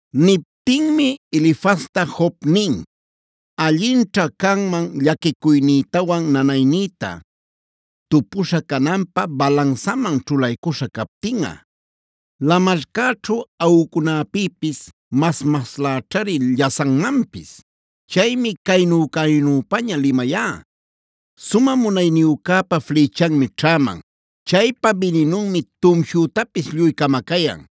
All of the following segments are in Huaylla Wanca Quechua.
Niptinmi Elifazta Job nin: “Allinćha canman llaquicuynïtawan nanaynïta, tupuśha cananpä balansaman ćhulaycuśha captinꞌa. Lamarcäćhu aꞌucunapïpis mas-masläćhari llasanmanpis. Chaymi caynü-caynüpaña limayá. Sumä munayniyücäpa flïchanmi ćhäman.a Chaypa bininunmi tumshütapis lluy camacayan.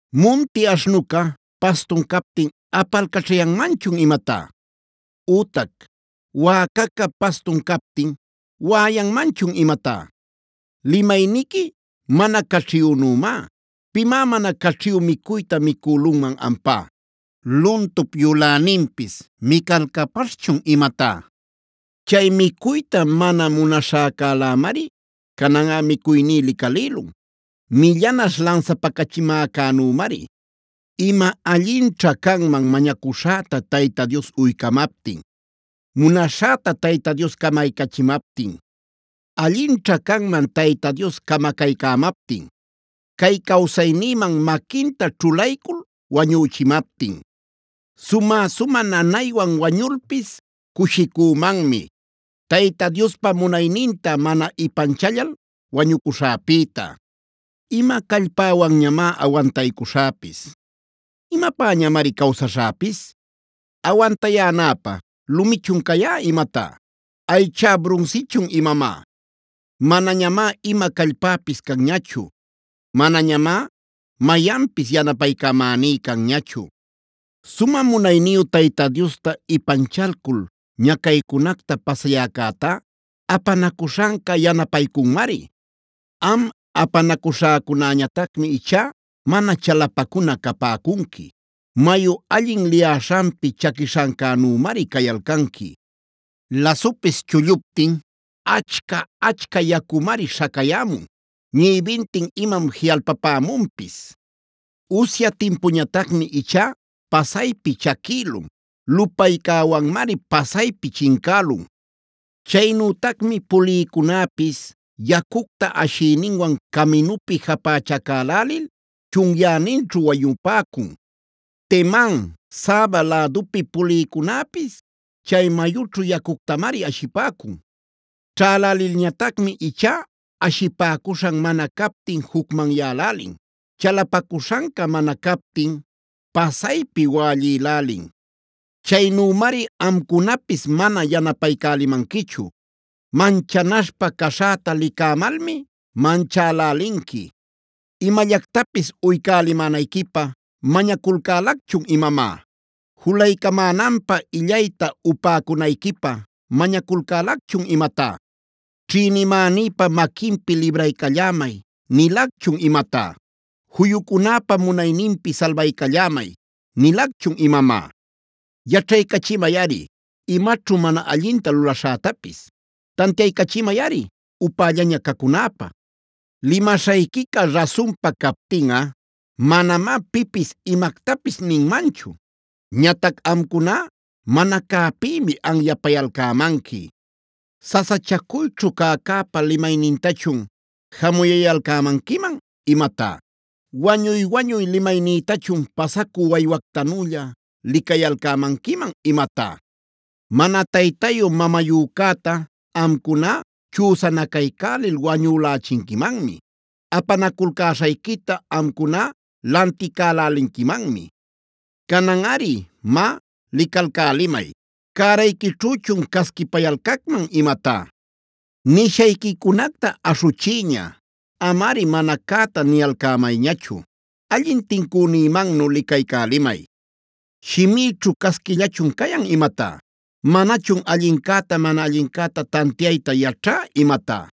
¿Munti aśhnuca pastun captin apalcaćhayanmanchun imatá? Ütac ¿wäcaca pastun captin waꞌayanmanchun imatá? Limayniqui mana caćhiyünümá, ¿pimá mana caćhiyü micuyta micülunman ampá? ¿Luntup yuläninpis micalcapaśhchun imatá? Chay micuyta mana munaśhäcälämari cananꞌa micuyní licalïlun, millanaśh lansapacachimäcänümari. “Ima allinćha canman mañacuśhäta Tayta Dios uycamaptin; munaśhäta Tayta Dios camaycachimaptin. Allinćha canman Tayta Dios camacaycämaptin, cay cawsaynïman maquinta ćhulaycul wañüchimaptin. Sumä-sumä nanaywan wañulpis cushicümanmi, Tayta Diospa munayninta mana ipanchallal wañucuśhäpïta. “¿Ima callpäwanñamá awantaycuśhäpis? ¿Imapäñamari cawsaśhäpis? ¿Awantayänäpä lumichun cayá imatá? ¿Aychá brunsichun imamá? Manañamá ima callpäpis canñachu; manañamá mayanpis yanapaycamäní canñachu. “Sumä munayniyu Tayta Diosta ipanchalcul ñacaycunacta pasayäcätá, apanacuśhanca yanapaycunmari. Am, apanacuśhäcunäñatacmi ichá mana chalapacuna capäcunqui; mayu allin liyäśhanpi chaquishancänümari cayalcanqui. Lasupisd chulluptin achca-achca yacumari śhacayämun; ñïbintin imam jiꞌalpapämunpis. Usya timpuñatacmi ichá pasaypi chaquïlun; lupaycäwanmari pasaypi chincälun. Chaynütacmi pulïcunäpis yacucta ashïninwan caminupi japächacälälil chunyäninćhu wañupäcun. Teman, Saba lädupi pulïcunäpis chay mayućhu yacuctamari ashipäcun. Ćhälälilñatacmi ichá ashipäcuśhan mana captin jucmanyälälin; chalapacuśhanca mana captin pasaypi wällïlälin. Chaynümari amcunapis mana yanapaycälimanquichu; manchanaśhpa caśhäta licämalmi manchälälinqui. ¿Imallactapis uycälimänayquipä mañaculcälacchun imamá? ¿Julaycamänanpä illayta upäcunayquipä mañaculcälacchun imatá? ¿Ćhïnimänïpa maquinpi libraycallämay nilacchun imatá? ¿Juyucunäpa munayninpi salbaycallämay nilacchun imamá? “¡Yaćhaycachimayꞌari! Imaćhu mana allinta lulaśhätapis tantiaycachimayꞌari upällaña cacunäpä. Limaśhayquica rasunpa captinꞌa manamá pipis imactapis ninmanchu. Ñatac amcuná mana cäpïmi anyapayalcämanqui. ¿Sasachacuyćhu cäcäpa limaynintachun jamuyayalcämanquiman imatá? ¿Wañuy-wañuy limaynïtachun pasacü waywactanülla licayalcämanquiman imatá? Mana taytayu-mamayücäta amcuná chüsanacaycälil wañülächinquimanmi; apanaculcäshayquita amcuná lanticalälinquimanmi. “Cananꞌari má licalcälimay; ¿cärayquićhüchun casquipayalcacman imatá? Nishayquicunacta aśhuchiyña; amari mana cäta niyalcämayñachu; allin tincünïmannu licaycälimay. ¿Shimïćhu casquillachun cayan imatá? ¿Manachun allincäta mana allincäta tantiayta yaćhá imatá?”